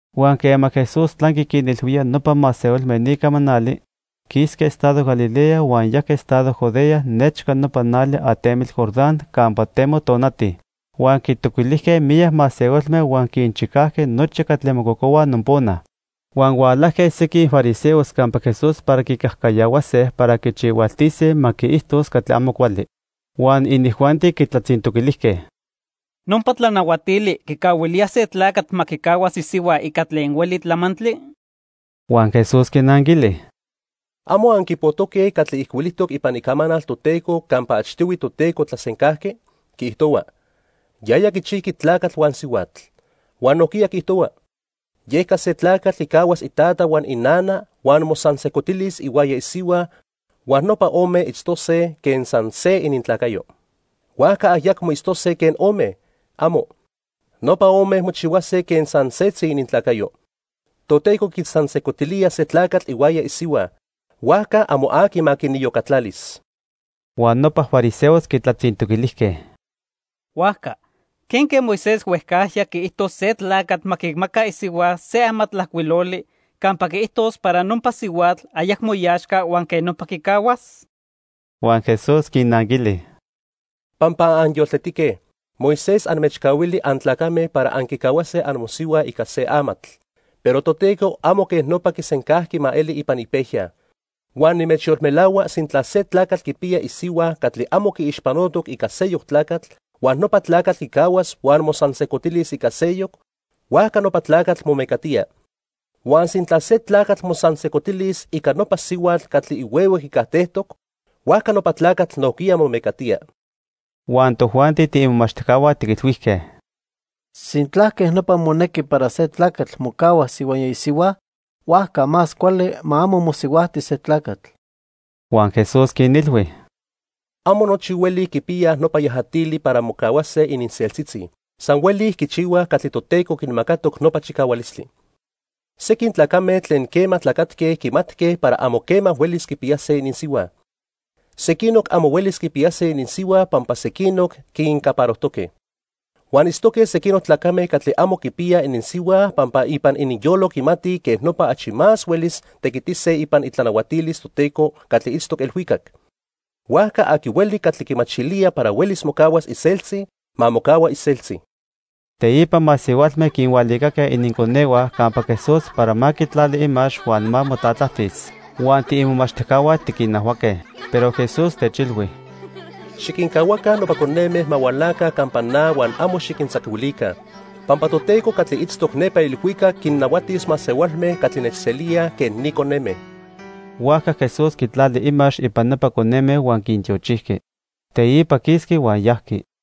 Huan quema Jesús tlanqui quinilhuía nopa masehualme ni camanali, quisqui estado Galilea huan yajqui estado Judea nechca nopa nali atentli Jordán campa temo tonati. Huan quitoquilijque miyac masehualme huan quinchicajqui nochi catli mococohuaj nopona. Huan hualajque sequin fariseos campa Jesús para quicajcayahuase para quichihualtise ma quiijtos catli amo cuali. Huan inijuanti quitlatzintoquilijque: —¿Nopa tlanahuatili quicahuilía se tlacatl ma quicahuas isihua ica tlen hueli tlamantli? Huan Jesús quinnanquili: —¿Amo anquipojtoque catli ijcuilijtoc ipan Icamanal Toteco campa achtihui Toteco tlasencajqui? Quiijtohua: 'Yaya quichijqui tlacatl huan sihuatl'. Huan nojquiya quiijtohua: 'Yeca se tlacatl quicahuas itata huan inana huan mosansejcotilis ihuaya isihua huan nopa ome itztose quen san se inintlacayo.' Huajca ayacmo itztose quen ome. ¡Amo! Nopa ome mochihuase quen san setzi inintlacayo. Toteco quinsansejcotilía se tlacatl ihuaya isihua, huajca amo aqui ma quiniyocatlalis. Huan nopa fariseos quitlatzintoquilijque: —Huajca ¿quenque Moisés huejcajya quiijto se tlacatl ma quimaca isihua se amatlajcuiloli campa quiijtos para nopa sihuatl ayacmo iaxca huan quej nopa quicahuas? Huan Jesús quinnanquili: —Pampa anyoltetique, Moisés anmechcahuili antlacame para anquicahuase amosihua ica se amatl, pero Toteco amo quej nopa quisencajqui ma eli ipan ipejya. Huan nimechyolmelahua sintla se tlacatl quipiya isihua catli amo quiixpanotoc ica seyoc tlacatl huan nopa tlacatl quicahuas huan mosansejcotilis ica seyoc, huajca nopa tlacatl momecatía. Huan sintla se tlacatl mosansejcotilis ica nopa sihuatl catli ihuehue quicajtejtoc, huajca nopa tlacatl nojquiya momecatía. Huan tojuanti tiimomachtijcahua tiquilhuijque: —Sintla quej nopa monequi para se tlacatl mocahuas ihuaya isihua, huajca más cuali ma amo mosihuajti se tlacatl. Huan Jesús quinilhui: —Amo nochi hueli quipiyaj nopa yajatili para mocahuase ininseltzitzi. San hueli quichihuaj catli Toteco quinmacatoc nopa chicahualistli. Sequin tlacame tlen quema tlacatque quimatque para amo quema huelis quipiyase ininsihua. Sequinoc amo huelis quipiyase ininsihua pampa sequinoc quincaparojtoque. Huan itztoque sequinoc tlacame catli amo quipiyaj ininsihua pampa ipan ininyolo quimatij quej nopa achi más huelis tequitise ipan itlanahuatilis Toteco catli itztoc ilhuicac. Huajca aqui hueli catli quimachilía para huelis mocahuas iseltzi, ma mocahua iseltzi. Teipa masehualme quinhualicaque ininconehua campa Jesús para ma quitlali imax huan ma motlatlajtis. Huan tiimomachtijcahua tiquinajhuaque. Pero Jesús techilhui: —Xiquincahuaca nopa coneme ma hualaca campa na huan amo xiquintzacuilica. Pampa Toteco catli itztoc nepa ilhuicac quinnahuatis masehualme catli nechselíaj quen ni coneme. Huajca Jesús quitlali imax ipan nopa coneme huan quintiochijqui. Teipa quisqui huan yajqui.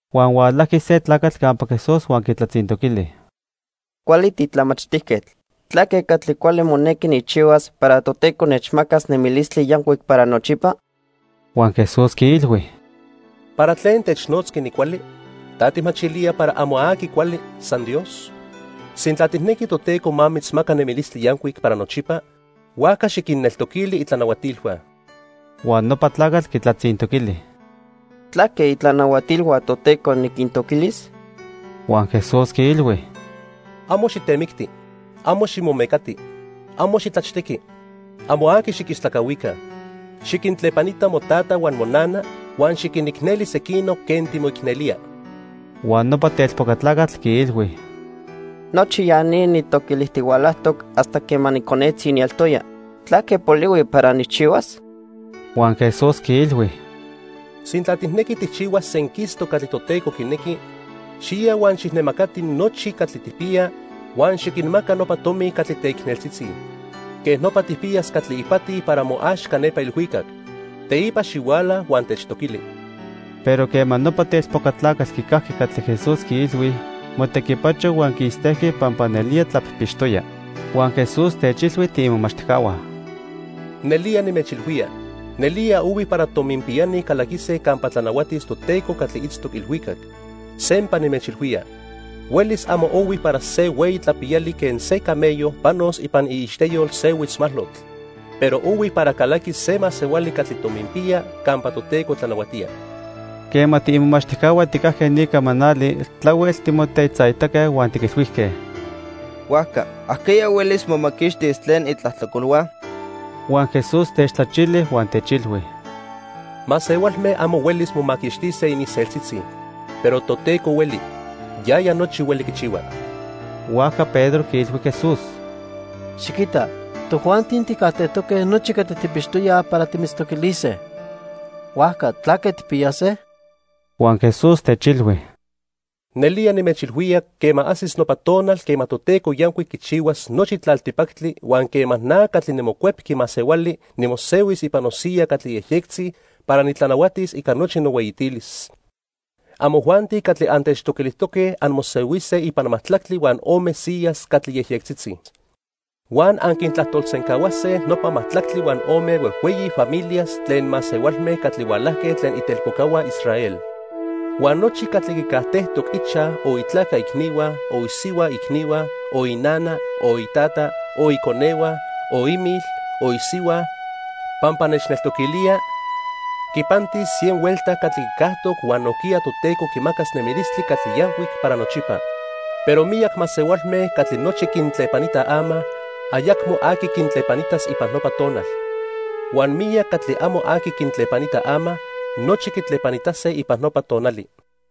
Huan hualajqui se tlacatl campa Jesús huan quitlatzintoquili: —Cuali titlamachtijquetl, ¿tlaque catli cuali monequi nijchihuas para Toteco nechmacas nemilistli yancuic para nochipa? Huan Jesús quiilhui: —¿Para tlen technotzqui nicuali? ¿Ta tijmachilía para amo aqui cuali, san Dios? Sintla tijnequi Toteco ma mitzmaca nemilistli yancuic para nochipa, huajca xiquinneltoquili itlanahuatilhua. Huan nopa tlacatl quitlatzintoquili: —¿Tlaque itlanahuatilhua Toteco niquintoquilis? Huan Jesús quiilhui: —Amo xitemicti, amo ximomecati, amo xitlachtequi, amo aqui xiquistlacahuica. Xiquintlepanita motata huan monana, huan xiquinicneli sequinoc quen timoicnelía. Huan nopa telpoca tlacatl quiilhui: —Nochi ya ni nijtoquilijtihualajtoc hasta quema niconetzi nieltoya. ¿Tlaque polihui para nijchihuas? Huan Jesús quiilhui: —Sintla tijnequi tijchihuas senquistoc catli Toteco quinequi, xiya huan xijnemacati nochi catli tijpiya huan xiquinmaca nopa tomi catli teicneltzitzi. Quej nopa tijpiyas catli ipati para moaxca nepa ilhuicac. Teipa xihuala huan techtoquili. Pero quema nopa telpoca tlacatl quicajqui catli Jesús quiilhui, motequipacho huan quistejqui pampa nelía tlapijpixtoya. Huan Jesús techilhui tiimomachtijcahua: —Nelía nimechilhuía, nelía ohui para tominpiyani calaquise campa tlanahuatis Toteco catli itztoc ilhuicac. Sempa nimechilhuía, huelis amo ohui para se hueyi tlapiyali quen se camello panos ipan iixteyol se huitzmalotl, pero ohui para calaquis se masehuali catli tominpiya campa Toteco tlanahuatía. Quema tiimomachtijcahua tijcajque ni camanali, tlahuel timotetzaitaque huan tiquilhuijque: —Huajca ¿ajqueya huelis momaquixtis tlen itlajtlacolhua? Huan Jesús techtlachili huan techilhui: —Masehualme amo huelis momaquixtise ininseltzitzi, pero Toteco hueli. Yaya nochi hueli quichihua. Huajca Pedro quiilhui Jesús: —Xiquita, tojuanti tijcajtejtoque nochi catli tijpixtoyaj para timitztoquilise. Huajca ¿tlaque tijpiyase? Huan Jesús techilhui: —Nelía nimechilhuía quema ajsis nopa tonal quema Toteco yancuic quichihuas nochi tlaltipactli huan quema na catli niMocuepqui Masehuali nimosehuis ipan nosiya catli yejyectzi para nitlanahuatis ica nochi nohueyitilis, amojuanti catli antechtoquilijtoque anmosehuise ipan majtlactli huan ome siyas catli yejyectzitzi. Huan anquintlajtolsencahuase nopa majtlactli huan ome huejhueyi familias tlen masehualme catli hualajque tlen itelpocahua Israel. Huan nochi catli quicajtejtoc ichaj, o itlaca icnihua, o isihua icnihua, o inana, o itata, o iconehua, o imil, o isihua, pampa nechneltoquilía, quipantis cien huelta catli quicajtoc huan nojquiya Toteco quimacas nemilistli catli yancuic para nochipa. Pero miyac masehualme catli nochi quintlepanitaj ama, ayacmo aqui quintlepanitas ipan nopa tonal. Huan miyac catli amo aqui quintlepanita ama, nochi quitlepanitase ipan nopa tonali.